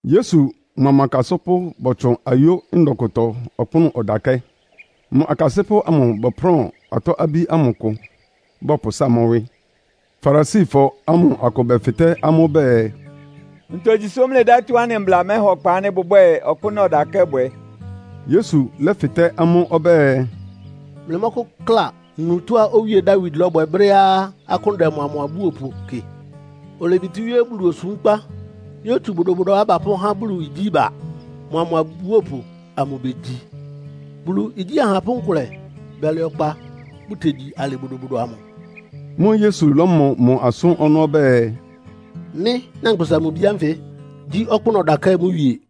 Yesu mʋa mʋ akasɩ́pʋ́ bɔtsʋn ayó ndɔ kʋtɔ ɔkpʋ́nʋ́ ɔdakɛ́. Mʋ akasɩ́pʋ́ amʋ bɔprʋ́ʋn atɔ́-abí ámʋ kʋ, bɔpʋsáa mʋ́ wɩ́. Farisifɔ ámʋ akʋ bɛfɩtɛ́ amʋ́ bɛɛ, “Ntogyi sʋ́ mlɩdɛ́ tɔ́á anɩ mbla mɛha ɔkpa ánɩ́ bʋbwɛ́ɛ ɔkpʋ́nʋ́ ɔdakɛ́ bwɛ?” Yesu lɛ́fɩtɛ́ amʋ́ ɔbɛ́ɛ, “Mlɩmɔ́kʋ́kla nu tɔ́á Owíe Dawid lɔ́bwɛ brɛ́á akʋ́n dɛ mʋa mʋ abúopʋ kɩ? Olebitíwíé Bulu osúmkpa yótsu bodobodoá bapʋ́há Bulu igyí ba, mʋa mʋ abúopʋ amʋ begyi. Bulu igyí ahapʋ́ nkʋlɛ bɛlɛ ɔkpa bʋ́tegyi alɩ bodobodo amʋ.” Mʋ́ʋ́ Yesu ɔlɔmɔ mʋ asʋ́n ɔnɔ́ ɔbɛ́ɛ, “Mɩ́, Nyankpʋsa-Mʋ-Bi ánfɩ gyí ɔkpʋ́nʋ́ ɔdakɛ́ mʋ wie.”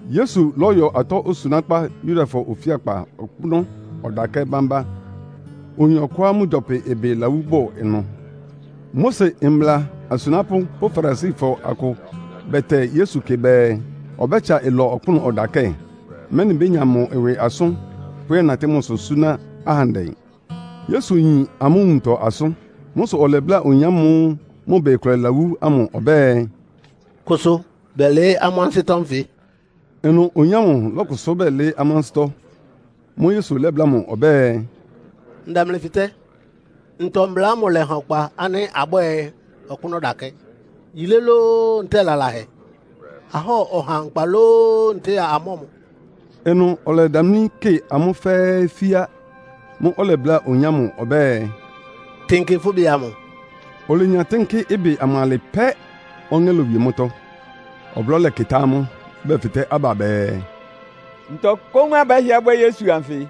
Yesu lɔ́yɔ atɔ́ osunákpá Yudafɔ ofíakpaɔkpʋ́nʋ́ ɔdakɛ́ bámbá. Oyin ɔkʋá mʋ gyɔpɩ ɩbɩ lawú bʋ ɩnʋ. Mose mbla asunápʋ́ pʋ́ Farisifɔ akʋ bɛtɛ Yesu kɩ bɛɛ, ɔbɛ́tsa ɩlɔ ɔkpʋ́nʋ́ ɔdakɛ́, mɛ́nɩ bénya mʋ ɩwɩ asʋ́n, pʋ́yɛ́natɩ́ mʋsʋ súná ahandɛ. Yesu yin amʋ́ nwuntɔ asʋ́n. Mʋ́ sʋ ɔlɛbláa oyin ámʋ́ʋ́ mʋ ɩbɩ kʋlɛ lawú ámʋ ɔbɛ́ɛ, “Kʋsʋ bɛlɩɩ́ amʋ́ ansɩ́tɔ́ nfɩ.” Ɩnʋ oyin ámʋ lɔ́kʋsʋ́ bɛlɩɩ́ amʋ́ ansɩ́tɔ́. Mʋ́ʋ́ Yesu lɛ́bláa amʋ́ ɔbɛ́ɛ, “Ndɛ mlɩ fɩtɛ́, ntɔ mbla ámʋ lɛ́ha ɔkpa ánɩ́ abwɛ́ɛ ɔkpʋ́nʋ́ ɔdakɛ́? Yilé lóó, ntɛ́ɛ lalahɛ? Ahɔ́ɔ ɔha nkpa lóó, ntɛ́ɛ amɔ́ɔ mʋ?” Ɩnʋ ɔlɛdamlí kɩ amʋ́ fɛ́ɛ́ fíá. Mʋ́ʋ́ ɔlɛbláa oyin ámʋ ɔbɛ́ɛ, “Tɩnkɩ fʋ́ ɩbɩ amʋ.” Olenya tɩ́nkɩ́ ɩbɩ amʋ alɩ pɛ́, ɔŋɛ́ lowie mʋ́tɔ́. Ɔblɔ́ lɛkɩtá amʋ́, bɛfɩtɛ́ aba bɛɛ, “Ntɔ kóún abɛ́hɩɛ bwɛ́ Yesu anfɩ?”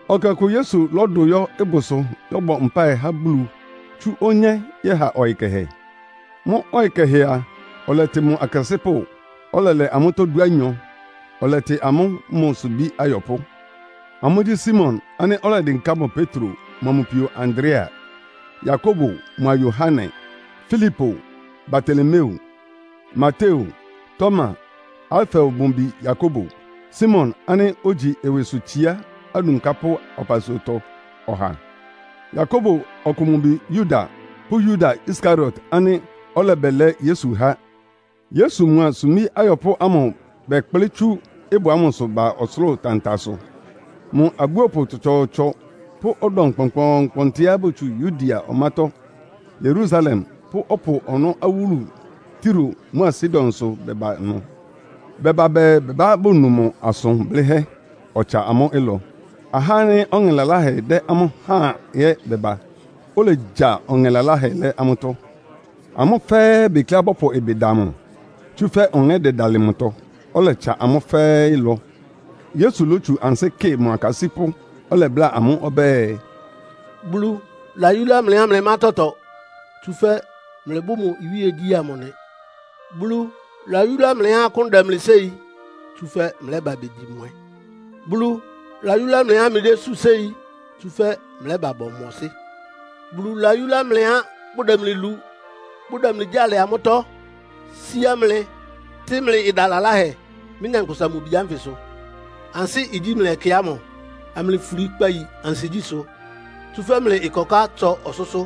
Ɛkɛ ɔkʋ Yesu lɔ́dʋ yɔ́ ɩbʋsʋ yɔ́bɔ mpáɩ há Bulu tsú onyé yɛ́ha ɔyɩ kɛhɛ. Mʋ́ ɔyɩ kɛhɛ a, ɔlɛtɩ mʋ akasɩ́pʋ́, ɔlɛlɛ amʋ́tɔ́ dúanyɔ, ɔlɛtɩ amʋ́ mʋ sumbí ayɔpʋ́. Amʋ́gyí, Simon ánɩ́ ɔlɛdɩnká mʋ Petro mʋa mʋ pio Andrea; Yakobo mʋa Yohane; Filipo, Bartolomeo, Mateo, Toma, Alfeo mʋ bi Yakobo, Simon ánɩ́ ogyi ɩwɩsʋtsiá adunkápʋ́ ɔpasuatɔ ɔha; Yakobo ɔkʋ mʋ bi Yuda pʋ́ Yuda Iskariot ánɩ́ ɔlɛbɛlɛ Yesu há. Yesu mʋa sumbí ayɔpʋ́ ámʋ bɛkplɩ́ tsú ɩbʋ ámʋsʋ ba ɔsʋlʋ́ʋ tantasʋ. Mʋ abúopʋ tsɔtsɔɔtsɔ pʋ́ ɔdɔm kpɔnkpɔɔnkpɔntɩá botsú Yudea ɔmátɔ́, Yerusalem pʋ́ ɔpʋ ɔnɔ́ awúlu Tiro mʋ́a Sidonsʋ bɛba ɩnʋ. Bɛba bɛɛ bɛbá bonu mʋ asʋn blɩ́hɛ́, ɔtsa amʋ́ ɩlɔ. Ahá ánɩ́ ɔŋɛ laláhɛ dɛ amʋ́ háan ɛ́ bɛba, olegya ɔŋɛ laláhɛ lɛ́ amʋ́tɔ́. Amʋ́ fɛ́ɛ́ bekleá bɔ́pʋ ɩbɩ da mʋ, tsúfɛ́ ɔŋɛ́ dɛdalɩ mʋtɔ, ɔlɛtsa amʋ́ fɛ́ɛ́ ɩlɔ. Yesu lótsu ansɩ́ kɩ mʋ akasɩ́pʋ́, ɔlɛbláa amʋ́ ɔbɛ́ɛ, “Bulu layúlá mlɩá mlɩmá tɔtɔ, tsúfɛ́ mlɩbʋ́ mʋ iwíegyí amʋ nɩ. Bulu layúlá mlɩá akʋ́n dɛ mlɩ séi, tsúfɛ́ mlɛ́ba begyi mwɛ. Bulu layúlá mlɩá mlɩdésú séi, tsúfɛ́ mlɛ́ba bɔmɔsɩ́. “Bulu layúlá mlɩá bʋdɛ mlɩ lu, bʋdɛ mlɩ gyáa lɛ amʋ́tɔ́, síá mlɩ, tɩ́ mlɩ ɩda laláhɛ mɩ́, Nyankpʋsa-Mʋ-Bi ánfɩ sʋ. Ansɩ́ igyí mlɩ ɛkɛ ámʋ, amlɩfuli kpayi ansigyísʋ́, tsúfɛ́ mlɩ ɩkɔká tsɔ ɔsʋ́sʋ́.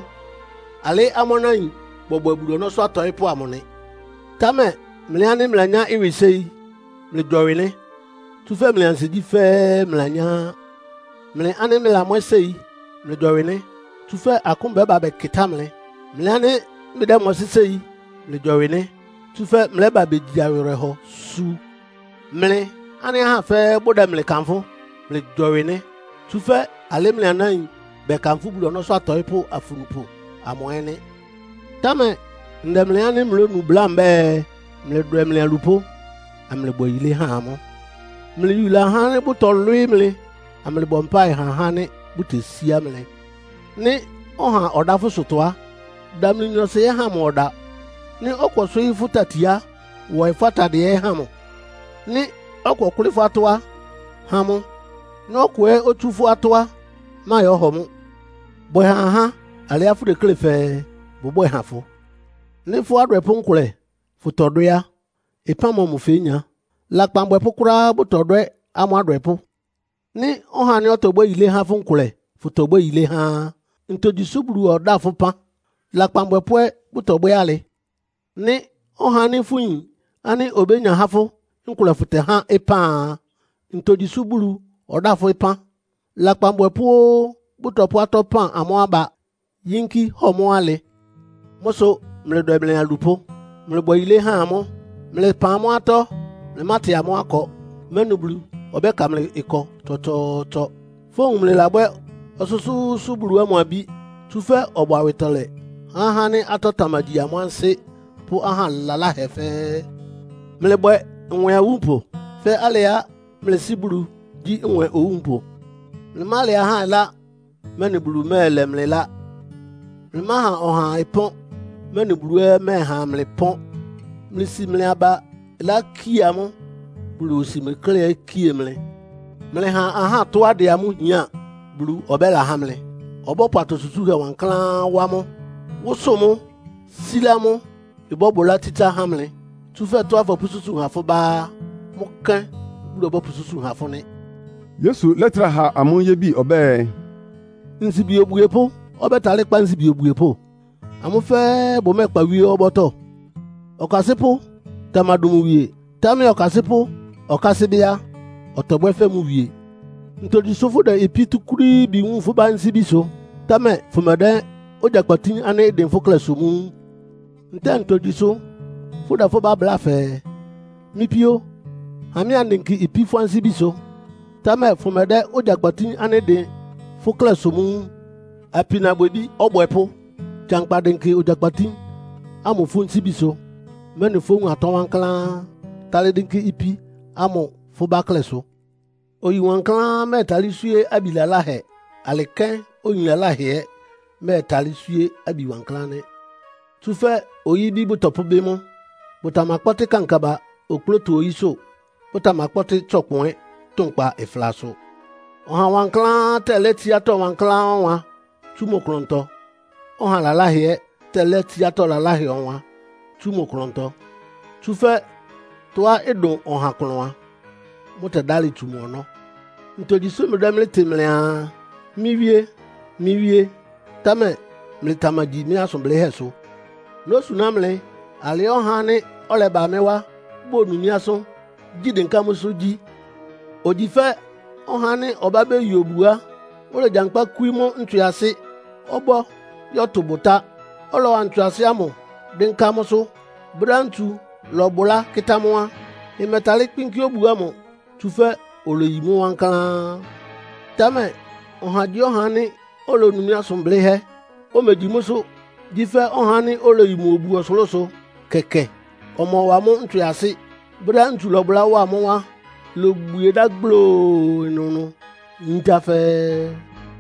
Alɩ́ amʋ́ anáin bɔbwɛ Bulu ɔnɔ́sʋ́ atɔɩ́pʋ́ amʋ nɩ. Támɛ mlɩ ánɩ́ mlɩlanyá ɩwɩ séi, mlɩgyɔwɩ nɩ́. Tsúfɛ́ mlɩ ansigyí fɛ́ɛ́ mlɩlanyá á. Mlɩ ánɩ́ mlɩlamwɛ́ séi, mlɩgyɔwɩ nɩ́. Tsúfɛ́ akʋ́n bɛ́ba bɛkɩtá mlɩ. Mlɩ ánɩ́ mlɩdɛ́mɔsɩ́ séi, mlɩgyɔwɩ nɩ́. Tsúfɛ́ mlɛ́ba begyi awɩrɛhɔ, su. “Mlɩ ánɩ́ ahá fɛ́ɛ́ bʋdɛ mlɩ kanfʋ́, mlɩgyɔwɩ, tsúfɛ́ alɩ́ mlɩ anáin bɛkanfʋ́ Bulu ɔnɔ́sʋ́ atɔɩ́pʋ́ afunupʋ amʋ ɛ́ nɩ́. “Támɛ ndɛ mlɩ ánɩ́ mlónu bláa mbɛ́ɛ, Mlɩdwɛ mlɩ alupʋ́, amlɩbwɛ yilé ha amʋ́. Mlɩyula ahá ánɩ́ bʋtɔlwɩ́ɩ́ mlɩ, amlɩbɔ mpáɩ ha ahá ánɩ́ bʋtesíá mlɩ. Nɩ́ ɔha ɔdá fʋ́ ɩsʋtɔ a, damli nyɔɔsɩ ɛ́ ha mʋ ɔda. Nɩ́ ɔkʋ ɔswɩ́ɩ́ fʋ́ tati á, wɔɩ fʋ́ atadɩɛ ɛ́ ha mʋ. Nɩ́ ɔkʋ ɔkʋ́lɩ́ fʋ́ atɔ́ á, ha mʋ. Nɩ́ ɔkʋ ɛ́ otsú fʋ́ atɔ́ á, máyɔ́hɔ mʋ́. Bwɛ ha ahá alɩá fʋdeklé fɛɛ bʋbwɛ́ɛ ha fʋ. “Nɩ́ fʋ́ adwɛpʋ́ nkʋlɛ fʋtɔdwɛ́ á, ɩpán mɔmʋ fénya? Lakpan abwɛpʋ́ kʋ́ráá bʋtɔdwɛ́ amʋ́ adwɛpʋ́. Nɩ́ ɔhá ánɩ́ ɔtɔbwɛ́ yilé há fʋ́ nkʋlɛ fʋ́tɔbwɛ́ yilé há á, ntogyi sʋ́ Bulu ɔdáa fʋ́ ɩpán? Lakpan abwɛpʋ́ ɛ́ bʋtɔbwɛ́ alɩ. Nɩ́ ɔhá ánɩ́ fʋyin ánɩ́ obénya há fʋ́ nkʋlɛ fʋtɛhá ɩpán a, ntogyi sʋ́ Bulu ɔdáa fʋ́ ɩpán? Lakpan abwɛpʋ́ óó bʋtɔpʋ́ atɔ́ pan amʋ́ aba, yínkí hɔ mʋ́ alɩ. Mʋ́ sʋ mlɩdwɛ mlɩ alupʋ́, mlɩbwɛ yilé ha amʋ́, mlɩpan amʋ́ atɔ́, mlɩmátɩ amʋ́ akɔ, mɛ́nɩ Bulu ɔbɛ́ka mlɩ ɩkɔ tsɔtsɔɔtsɔ. Fówun mlɩlabwɛ́ Ɔsʋ́sʋ́ʋ́sʋ́ Bulu ámʋ abí. Tsúfɛ́ ɔbʋ awɩtɔlɛ há ahá ánɩ́ atɔ́ tamagyi amʋ́ ansɩ́ pʋ́ aha laláhɛ fɛ́ɛ́. Mlɩbwɛ nwɛ awúnpʋ fɛ́ alɩá mlɩ Sɩ́ Bulu gyí nwɛ owúnpʋ. “Mlɩmálɛ ahá ɩlá, mɛ́nɩ Bulu mɛ́ɛlɛ mlɩ ɩlá. Mlɩmáha ɔhaa ɩpɔ́n, mɛ́nɩ Bulu ɛ́ ɔmɛ́ɛha mlɩ pɔ́n. Mlɩsi mlɩ aba ɩlá kie amʋ́, Bulu osi mlɩ klɛ́ kie mlɩ. Mlɩha ahá tɔ́á dɛ amʋ́ hián, Bulu ɔbɛ́lahá mlɩ. Ɔbɔ́pʋ atɔ susúhɛ wankláán wá mʋ́, wʋ́sʋ́ʋ mʋ́, sílá mʋ́, ɩbɔ́bʋlá tsítsá há mlɩ. Tsúfɛ́ tɔ́á fɔpʋ́súsu ha fʋ́ bá á, mʋ́ kɛ́n Bulu ɔbɔ́pʋsúsu ha fʋ nɩ́.” Yesu lɛ́trá ha amʋ́ yébi ɔbɛ́ɛ, “Nsibi obwiepʋ́ ɔbɛ́talɩ́ kpá nsibi obwiepʋ́? Amʋ́ fɛ́ɛ́ bʋmɛ́ɛkpa wíé ɔbɔ́tɔ́? Ɔkasɩ́pʋ́ tamadʋn mʋ wie, támɛ ɔkasɩ́pʋ́ ɔkásɩ́ bɩ́ á, ɔtɔbwɛ́ fɛ́ mʋ wie. “Ntogyi sʋ́ fʋ́dɛ ipí túkúrííbi wúun fʋ́ bá nsíbisʋ, támɛ fʋmɛdɛ́ ogyakpatín ánɩ́ ɩdɩn fʋ́ klɛ́sʋ mʋ́ wúun? Ntɛ́ɛ ntogyi sʋ́ fʋ́dɛ fʋ́ bá bláa fɛɛ, ‘Mɩ́ píó, ha mɩ́ andɩnkɩ ipí fʋ́ nsíbisʋ’, támɛ fʋmɛdɛ́ ogyakpatín ánɩ́ ɩdɩn fʋ́ klɛ́sʋ mʋ́ wun? Apinabwɛbí ɔbwɛpʋ́, gyankpa dɩnkɩ ogyakpatín ámʋ fʋ́ nsíbisʋ, mɛ́nɩ fówun atɔ́ wankláán, tálɩ́ dɩ́nkɩ́ ipí ámʋ fʋ́ bá klɛ́sʋ. “Oyi wankláán mɛ́ɛtalɩ́ swíé abi laláhɛ. Alɩ kɛ́n oyi laláhɛ ɛ́ mɛ́ɛtalɩ́ swíé abi wankláán nɩ́. Tsúfɛ́ oyí-ibí bʋtɔpʋ́bɩ́ mʋ́. Bʋtamakpɔ́tɩ́ kankaba okplóto oyísʋ́, bʋtamakpɔ́tɩ́ tsɔkpʋn ɛ́ tʋnkpa ɩflasʋ. Ɔha wankláán tɛlɛ́ tsiátɔ́ wankláán ɔwan tsú mʋ klʋntɔ, ɔha laláhɛ ɛ́ tɛlɛ́ tsiátɔ́ laláhɛ ɔwan tsú mʋ klʋntɔ. Tsúfɛ́ tɔ́á ɩdʋn ɔha klʋn a, mʋ́tɛ́dálɩ́ tsu mʋ ɔnɔ́. “Ntogyi sʋ́ mlɩdɛ́ mɩ́ tɩ mlɩaa, ‘Mɩ́ Wíé! Mɩ́ Wíé!’ támɛ mlɩtamagyi mɩ́ asʋn blɩ́hɛ́sʋ? Nósuná mlɩ alɩá ɔhá ánɩ́ ɔlɛba mɩ́ wá bonu mɩ́ asʋ́n, gyi dɩnká mʋ́sʋ́ gyí. Ogyi fɛ́ ɔhá ánɩ́ ɔbá beyi obu á, olegyankpá kwí mʋ́ ntswɩasɩ ɔbɔ́ yɔ́tʋ bʋtá, ɔlɔwa ntswɩasɩ ámʋ dɩ́nká mʋ́sʋ́. Brɛ́á ntsu lɔ́bʋlá kɩ́tá mʋ́ á, ɩmɛtalɩ́ kpɩ́nkɩ́ obu ámʋ, tsúfɛ́ oleyi mʋ́ wankláán. Támɛ ɔhagyíɔha ánɩ́ olonu mɩ́ asʋn blɩ́hɛ́, omegyi mʋ́sʋ́ gyí fɛ́ ɔhá ánɩ́ oleyi mʋ obu ɔsʋlʋ́sʋ kɛkɛ, ɔmɔwa mʋ́ ntswɩasɩ. Brɛ́á ntsu lɔbʋlá wa mʋ́ á, ilobwie dá gbloo ɩnʋnʋ, yíntá fɛ́ɛ́!”